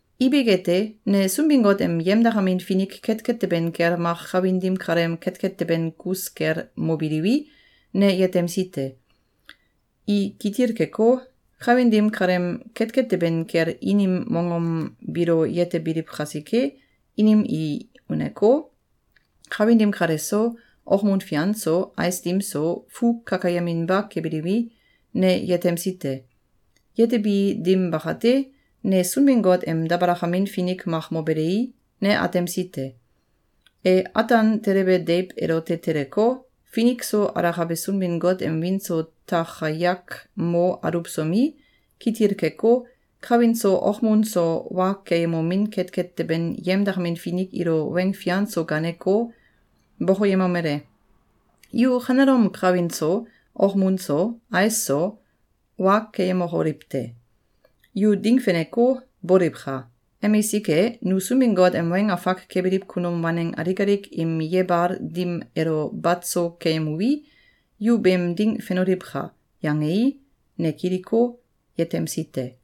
Ibik ete, ne Sunbin-Got em yemdakamin finik ketket teben kel mak kawin dim kaleem ketket teben kus kel mobiliwi, ne yetemsi te. I kitil keko, kawin dim kaleem ketket teben kel inim mongom biilo yetebiliw kasike, inim i uneko, kawin dim kale so, okmun fian so, ais dim so, fu kakayeminba kebiliwi, ne yetemsi te. Yetebi dim bakate, ne Sunbin-Got em dabalakamin finik mak mobelei, ne atemsi te. E ataan telebe deiw elote teleko, finik so alakabe Sunbin-Got em wiin so takayak mo aluwsomi, kitil keko, kawin so okmun so wa keyemomin ketket teben yemdakamin finik ilo weng fian so gaaneko, bokoyemomele: “Yu kanelom kawin so, okmun so, ais so, wa keyemokoliw te! Yu ding feneko, boliwka! Emisik e, nu Sunbin-Got em weng afak kebiliw kunum waneng alik alik im yebal dim elo bat so keyemuwi, yu beem ding fenoliwka!”, yangei, ne kiliko, yetemsi te.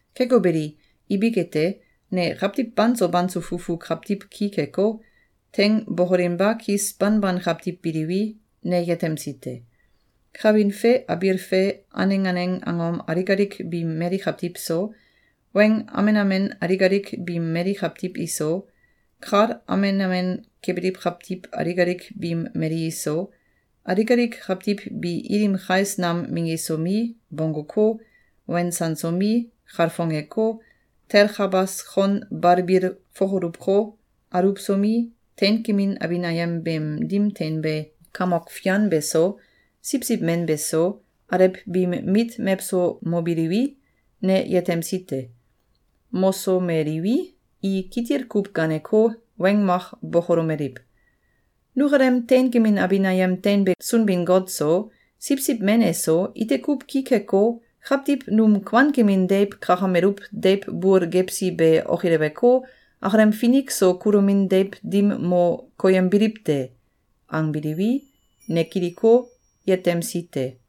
Keko beli, ibik ete, ne kawtiw banso banso fufu kawtiw ki keko, teing bokolinba kis banban kawtiw biliwi, ne yetemsi te. Kawin fe abiil fe aneng aneng angom alik alik biim mali kawtiw so, weng amen amen alik alik biim mali kawtiw iso, kal amen amen kebiliw kawtiw alik alik biim mali iso, alik alik kawtiw bi ilim kais nam minggisomi, bongguko, wensansomi, kalfongeko, telkabas kon balbil fokoluwko, aluwsomi, teinkemin abin ayem beem dim teinbe Kamok Fian beso, Siwsiw Men beso, alew biim mit mewso mobiliwi, ne yetemsi te. Mosomeliwi, i kitil kuw gaaneko, weng mak bokolomeliw: “Nukalem teinkemin abin ayem teinbe Sunbin-Got so, Siwsiw Men eso, ite kuw ki keko, kawtiw num kuankemin deiw kakameluw deiw bul gewsi be okileweko, akalem finik so kulomin deiw dim mo koyembiliw te.”, angbiliwi, ne kiliko, yetemsi te.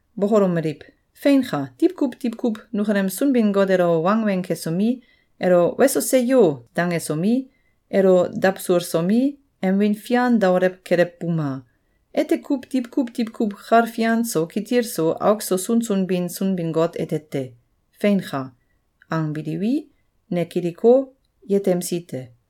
bokolomeliw: “Feinka! Diwkuw diwkuw nukalem Sunbin-Got elo wangweng kesomi, elo “Weso! Seyo!”, dangesomi, elo dawsulsomi, em wiin fian daolew kelewbuma! Ete kuw diwkuw diwkuw kal fian so, kitil so, auk so sunsun bin Sunbin-Got ete te. Feinka!”, angbiliwi, ne kiliko, yetemsi te.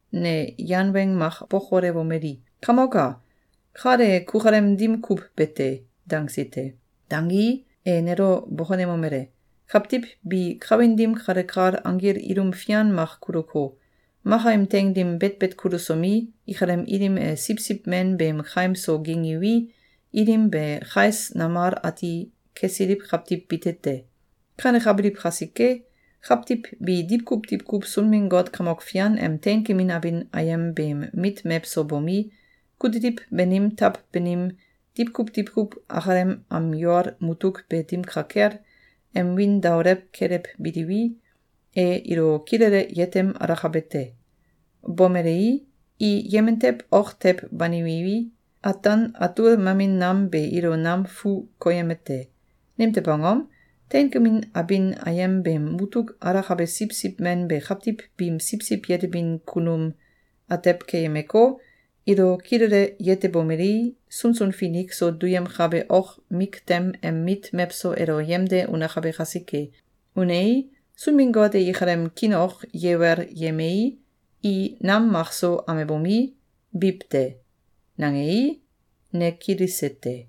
ne yan weng mak bokolewomeli: “Kamok a! Kal e kukalem dim kuw be te!”, dangsi te. Dangii, e nelo bokonemomele: “Kawtiw bi kawin dim kale kal anggil ilum fian mak kuluko, maka im teing dim betbet kulusomi, ikalem ilim e Siwsiw Men beem kaim so gingiwi, ilim be kais namal ati kesiliw kawtiw bite te. Kanekabiliw kasike, kawtiw bi diwkuw diwkuw Sunbin-Got Kamok Fian em teinkemin abin ayem beem mit mewso bomi, kutiliw banim taw banim, diwkuw diwkuw akalem am yol mutuk be dim ka kel, em wiin daolew kelewbiliwi, e ilo kilele yetem alakabe te. Bomelei, i yemen tew ok tew banimiwi, ataan atul mamin nam be ilo nam fu koyeme te. Nimtew angom? Teinkemin abin ayem beem mutuk alakabe Siwsiw Men be kawtiw biim siwsiw yetebin kunum atew keyemeko, ilo kilele yetebomelei, sunsun finik so duyemkabe ok miktem em mit mewso elo yemde unakabe kasike. Unei, Sunbin-Got e ikalem kiin ok yewel yemei, i nam makso amebomi, biw te.”, nangei, ne kilise te.